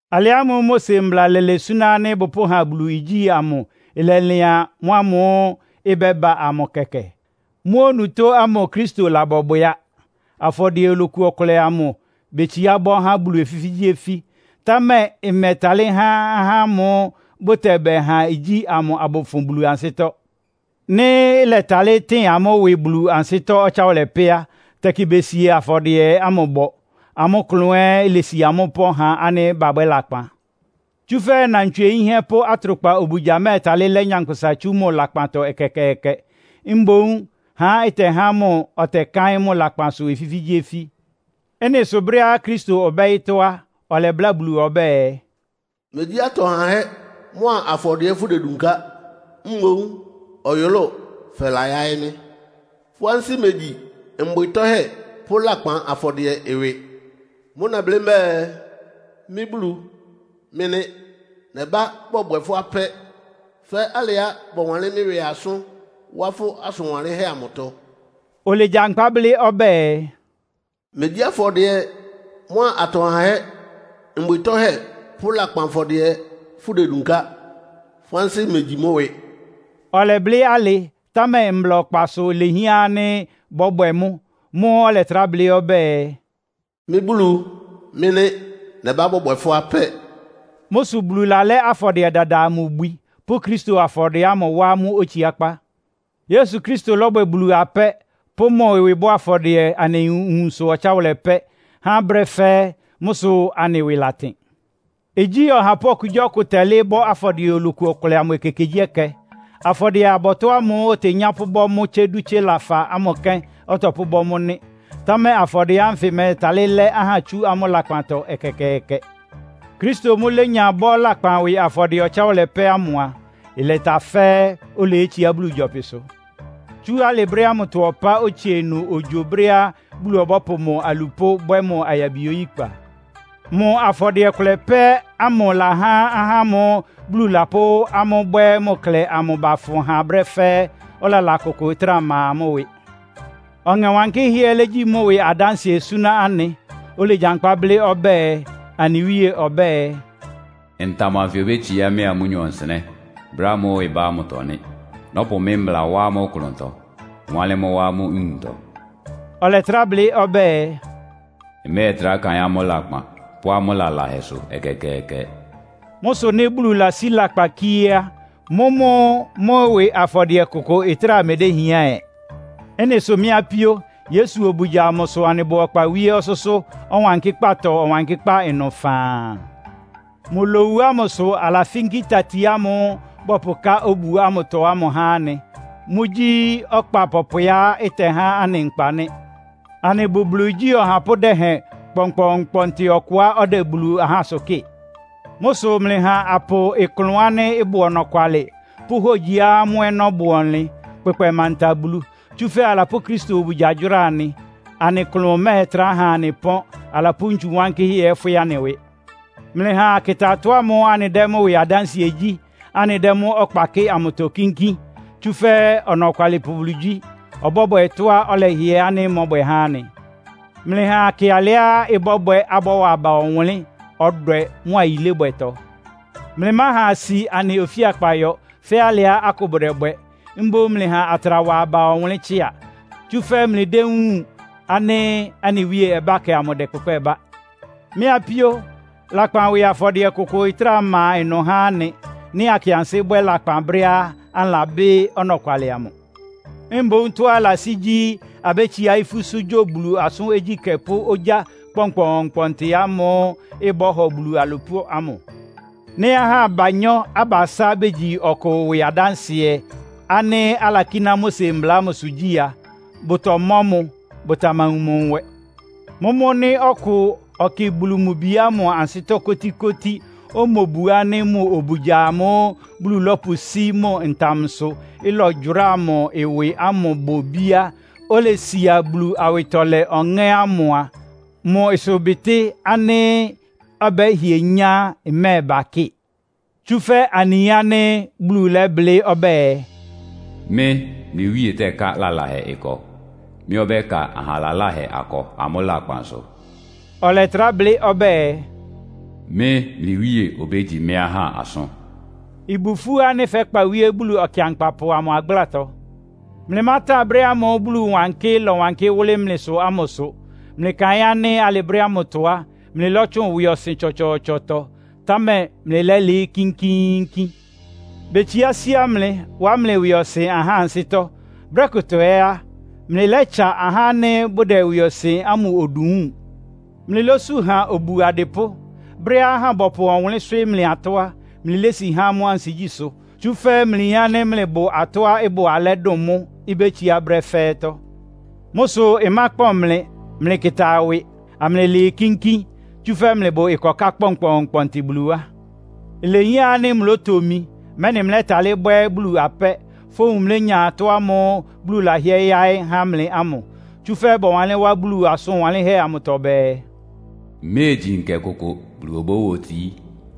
Alɩ ámʋ́ʋ́ Mose mbla lɛ́lɛ súná ánɩ́ bʋpʋ́ha Bulu igyí amʋ ɩlɛlɩan mʋ́ ámʋ́ʋ́ ɩbɛ́ba amʋ kɛkɛ. Mʋ́ onutó ámʋ Kristo labɔbwɛ á. Afɔdɩɛ oloku ɔkʋlɛ amʋ betsiá bɔ́ há Bulu ofífígyíofí. Támɛ ɩmɛtalɩ́ há ahá ámʋ́ʋ́ bʋtɛbɛha igyí amʋ abʋfʋn Bulu ansɩ́tɔ́. Nɩ́ ɩlɛtalɩ́ tɩn amʋ́ ɩwɩ Bulu ansɩ́tɔ́ ɔtsáwʋlɛ pɛ́ á, tɛkɩ besi afɔdɩɛ ámʋ bɔ, amʋ́ klʋn ɛ́ ilesi amʋ́ ɩpɔ́n ha ánɩ́ babwɛ́ lakpan. Tsúfɛ́ nnantswie yínhɛ́ pʋ́ atrʋkpa obugya mɛ́ɛtalɩ́ lɛ́ nyankpʋsa tsú mʋ lakpantɔ ɛkɛkɛɛkɛ. Mboún ha ɩtɛhá mʋ ɔtɛkáɩ́n mʋ lakpansʋ ofífígyíofí. Ɩ́nɩ sʋ brɛ́á Kristo ɔbá ɔyɩ́tɔ́ á, ɔlɛbláa Bulu ɔbɛ́ɛ, “Megyí atɔ hahɛ́ mʋ́a afɔdɩɛ fʋ́dedunká. Mboún ɔyʋlʋ́ʋ fɛla yáɩ́ mɩ́. Fʋ́ ansɩ́ megyi mbwɩ tɔ́hɛ́ pʋ́ lakpan afɔdɩɛ ɩwɩ. Mʋ́ʋ́ nɛblɩ́ mbɛ́ɛ, ‘Mɩ́ Bulu, mɩ́ nɩ́. Nɛbá bɔbwɛ fʋ́ apɛ́, fɛ́ alɩá bɔwanlɩ́n mɩ́ ɩwɩ asʋ́n wá fʋ́ asʋn wanlɩ́nhɛ́ amʋtɔ.’” Olegyankpá blɩ́ ɔbɛ́ɛ, “Megyí afɔdɩɛ mʋ́a atɔ hahɛ́, mbwɩ tɔ́hɛ́ pʋ́ lakpan afɔdɩɛ fʋ́dedunká. Fʋ́ ansɩ́ megyi mʋ́ ɩwɩ.” Ɔlɛblɩ́ alɩ, támɛ mbla ɔkpasʋ́ ilehián ánɩ́ bɔ́bwɛ mʋ́. Mʋ́ʋ́ ɔlɛtrá blɩ́ ɔbɛ́ɛ, “Mɩ́ Bulu, mɩ́ nɩ́. Nɛbá bɔbwɛ fʋ́ apɛ́.” Mʋ́ sʋ Bulu lalɛ́ afɔdɩɛ dada amʋ ibwi, pʋ́ Kristo afɔdɩɛ ámʋ wá mʋ́ otsiákpá. Yesu Kristo lɔ́bwɛ Bulu apɛ́, pʋ́ mʋ ɩwɩ bɔ́ afɔdɩɛ anɩ nwunsʋ ɔtsáwʋlɛ pɛ́, há brɛ́ fɛ́ɛ́. Mʋ́ sʋ anɩ ɩwɩ latɩn. Igyí ɔhapʋ́ okugyíɔkʋ tɛlɩ́ɩ́ bɔ́ afɔdɩɛ oloku ɔkʋlɛ amʋ ekekegyíɛkɛ. Afɔdɩɛ-abɔtɔ́ ámʋ́ʋ́ otenyá pʋ́bɔ́ mʋ́ tsé dú tsé lafa ámʋ kɛ́n ɔtɔpʋ́bɔ́ mʋ́ nɩ́. Támɛ afɔdɩɛ ánfɩ mɛ́ɛtalɩ́ lɛ́ ahá tsú amʋ́ lakpantɔ ɛkɛkɛɛkɛ. Kristo mʋ́ lénya bɔ́ lakpan ɩwɩ afɔdɩɛ ɔtsáwʋlɛ pɛ́ ámʋ a, ɩlɛta fɛ́ɛ́, oleyétsiá Bulu gyɔpɩsʋ. Tsú alɩ brɛ́ ámʋtɔ ɔpá otsie ɩnʋ ogyo brɛ́á Bulu ɔbɔ́pʋ mʋ alupʋ́ bwɛ́ mʋ ayabi oyíkpa. Mʋ afɔdɩɛ kʋlɛ pɛ́ ámʋ ɩlahá ahá ámʋ́ʋ́ Bulu lapʋ́ amʋ́ bwɛ́ mʋ klɛ amʋ bafʋn ha brɛ́ fɛ́ɛ́, ɔlala kʋkʋʋkʋ ɩtráa ma amʋ́ ɩwɩ. Ɔŋɛ Wankɩ́hɛ́ ɛ́ légyi mʋ́ ɩwɩ adánsɩɛ súná anɩ. Olegyankpá blɩ́ ɔbɛ́ɛ, Anɩ Wíe ɔbɛ́ɛ, “Ntam anfɩ obétsiá mɩ́a amʋ́nyɔ nsɩnɛ́, brɛ́ ámʋ́ʋ́ ɩbá ámʋtɔ nɩ́. Nɔ́pʋ mɩ́ mbla wá amʋ́ klʋntɔ, wánlɩ́n mʋ́ wá amʋ́ nwuntɔ.” Ɔlɛtrá blɩ́ ɔbɛ́ɛ, “Mmɛ́ɛtrá kaɩ́n amʋ́ lakpan pʋ́ amʋ́ lalahɛsʋ ɛkɛkɛɛkɛ.” Mʋ́ sʋ nɩ́ Bulu lasí lakpan kíé á, mʋ́mʋ́ mʋ́ ɩwɩ afɔdɩɛ kʋkʋ ɩtráa medéhián ɛ. Ɩ́nɩ sʋ mɩ́ apíó, Yesu obugya amʋ sʋ anɩbʋ ɔkpa wíé ɔsʋ́sʋ́ Ɔwankɩ́kpátɔ Ɔwankɩ́kpá ɩnʋ faan. Mʋ lowu ámʋ sʋ alafínkí tati ámʋ́ʋ́ bɔpʋká obu ámʋtɔ ámʋ há anɩ. Mʋ́gyí ɔkpa pɔpwɛá ɩtɛhá anɩ nkpa nɩ́. Anɩbʋ Bulu igyí ɔhapʋ́ dɛhɛn kpɔnkpɔɔnkpɔntɩ ɔkʋá ɔdɛ Bulu ahásʋ kɩ́ɩ. Mʋ́ sʋ mlɩha apʋ ɩklʋn ánɩ́ ɩbʋ ɔnɔkwalɩ, pʋ́ hógyiá mʋ́ ɔnɔ́ bʋ ɔnlɩn kpʋkpɛ manta Bulu. Tsúfɛ́ alapʋ́ Kristo obugya gyʋ́ra anɩ. Anɩ klʋn mɛ́ɛtrá ha anɩ pɔ́n, alapʋ́ ntsu wánkɩ́hɛ́ ɛ́ fwɩ́ anɩ ɩwɩ. Mlɩha akɩta tɔ́ ámʋ́ʋ́ anɩdɛ́ mʋ́ ɩwɩ adánsɩɛ gyí, anɩdɛ́ mʋ́ ɔkpa kɩ́ɩ amʋtɔ kínkín, tsúfɛ́ Ɔnɔkwalɩpʋ Bulu gyí. Ɔbɔ́bwɛ tɔ́á ɔlɛhɩɛ ánɩ́ mɔ́bwɛ há anɩ. Mlɩha akɩ alɩá ɩbɔ́bwɛ abɔ́wa aba ɔwʋnlɩ́n, ɔdwɛ mʋ́a yilébwɛtɔ. Mlɩmáha asi anɩ ofíakpa yɔ, fɛ́ alɩá akʋ bʋdɛbwɛ. Mboún mlɩha atra wa aba ɔwʋnlɩ́n tsɩ́a. Tsúfɛ́ mlɩdéwúun ánɩ́ anɩ Wíe ɔbákɛ ámʋ ɩdɛkpʋkpɛ́ bá. Mɩ́ apíó, lakpan ɩwɩ afɔdɩɛ kʋkʋ ɩtráa ma ɩnʋ há anɩ, nɩ́ akɩ ansɩ́ bwɛ́ lakpan brɛ́á anɩlabɩ́ ɔnɔkwalɩ amʋ. Mboún tɔ́á ɩlasí gyí, abétsiá ifúsʋ́ gyo Bulu asʋ́n ogyíkɛ́ pʋ́ ogyá kpɔnkpɔɔnkpɔntɩ ámʋ́ʋ́ ɩbɔ́hɔ Bulu alupʋ́ ámʋ. Nɩ́ ahá abanyɔ́-abasá begyi ɔkʋ ɩwɩ adánsɩɛ, ánɩ́ alakíná Mose mbla ámʋsʋ gyí a, bʋtɔmɔ́ mʋ. Bʋtamawun mʋ nwɛ. Mʋ́mʋ́ nɩ́ ɔkʋ ɔkɩ Bulu mʋ Bi ámʋ ansɩ́tɔ́ kótíkótí, omobu ánɩ́ mʋ obugya amʋ́ʋ́ Bulu lɔ́pʋsí mʋ ntamsʋ, ɩlɔgyʋráa mʋ ɩwɩ ámʋ bʋ ibíá, olesia Bulu awɩtɔlɛ Ɔŋɛ́ ámʋ mʋ́ á, mʋ ɩsʋbɩtɩ́ ánɩ́ ɔbɛ́hɩɛ nyá mɛ́ɛba kɩ́ɩ. Tsúfɛ́ anɩyin ánɩ́ Bulu lɛ́blɩ́ ɔbɛ́ɛ, “Mɩ́, mlɩ Wíe tɛ́ká lalahɛ ɩkɔ. Mɩ́ ɔbɛ́ka aha laláhɛ akɔ amʋ́ lakpan sʋ.” Ɔlɛtrá blɩ́ ɔbɛ́ɛ, “Mɩ́, mlɩ Wíe obégyi mɩ́ ahá asʋ́n.” Ɩbʋ ifú ánɩ́ fɛ́kpa wíé Bulu Ɔkɩankpapʋ amʋ agblátɔ. Mlɩmátan brɛ́ ámʋ́ʋ́ Bulu wankɩ lɔ́wankɩ́ wʋ́lɩ́ mlɩsʋ ámʋsʋ. Mlɩkaɩn ánɩ́ alɩ brɛ́ ámʋtɔ á, mlɩlɔ́tsʋn ɩwɩɔsɩn tsɔtsɔɔtsɔtɔ, támɛ mlɩlɛ́lɩɩ́ kínkíínkín. Betsiá síá mlɩ, wá mlɩ ɩwɩɔsɩn ahá ansɩ́tɔ́. Brɛ́ kʋtɔ ɛ́ á, mlɩlɛ́tsa ahá ánɩ́ bʋdɛ ɩwɩɔsɩn ámʋ odu wúun. Mlɩlósú ha obu adɩpʋ́. Brɛ́á ahá bɔpʋ ɔwʋnlɩ́n swɩ́ɩ́ mlɩ atɔ́ á, mlɩlési há amʋ́ ansigyísʋ́. Tsúfɛ́ mlɩyin ánɩ́ mlɩbʋ atɔ́á ɩbʋ alɛ́ dʋn mʋ́, ibétsiá brɛ́ fɛ́ɛ́tɔ́. Mʋ́ sʋ ɩmákpɔn mlɩ. Mlɩkɩta ɩwɩ, amlɩlɩɩ kínkín, tsúfɛ́ mlɩbʋ ɩkɔká kpɔnkpɔɔnkpɔntɩ Bulu wá. Ilehián ánɩ́ mlótomi, mɛ́nɩ mlɛ́talɩ́ bwɛ́ Bulu apɛ́, fówun mlénya ɩtɔ́ ámʋ́ʋ́ Bulu lɛ́hɩɛ yáɩ́ há mlɩ ámʋ. Tsúfɛ́ bɔwanlɩ́n wá Bulu asʋn wanlɩ́nhɛ́ amʋtɔ bɛɛ, “Iméegyi nkɛ kʋkʋ Bulu obówotií.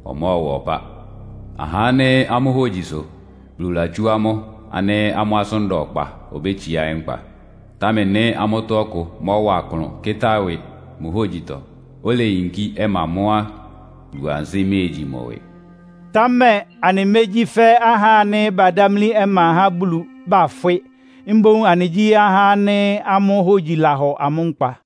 Ɔmɔ́ɔwa ɔpá. Ahá ánɩ́ amʋ́ hógyi sʋ Bulu latsú amʋ́ ánɩ́ amʋ́ asʋ́n da ɔkpa obétsiá nkpa. Támɛ nɩ́ amʋ́tɔ́ ɔkʋ mɔ́wa klʋn kɩ́tá ɩwɩ mʋ hógyitɔ, oleyinkí ɔma mʋ́ á, Bulu ansɩ́ méegyi mʋ ɩwɩ.” Támɛ anɩmégyí fɛ́ ahá ánɩ́ badámlí ɔma há Bulu, bafwɩ́. Mboún anɩgyí ahá ánɩ́ amʋ́ hógyi lahɔ amʋ́ nkpa.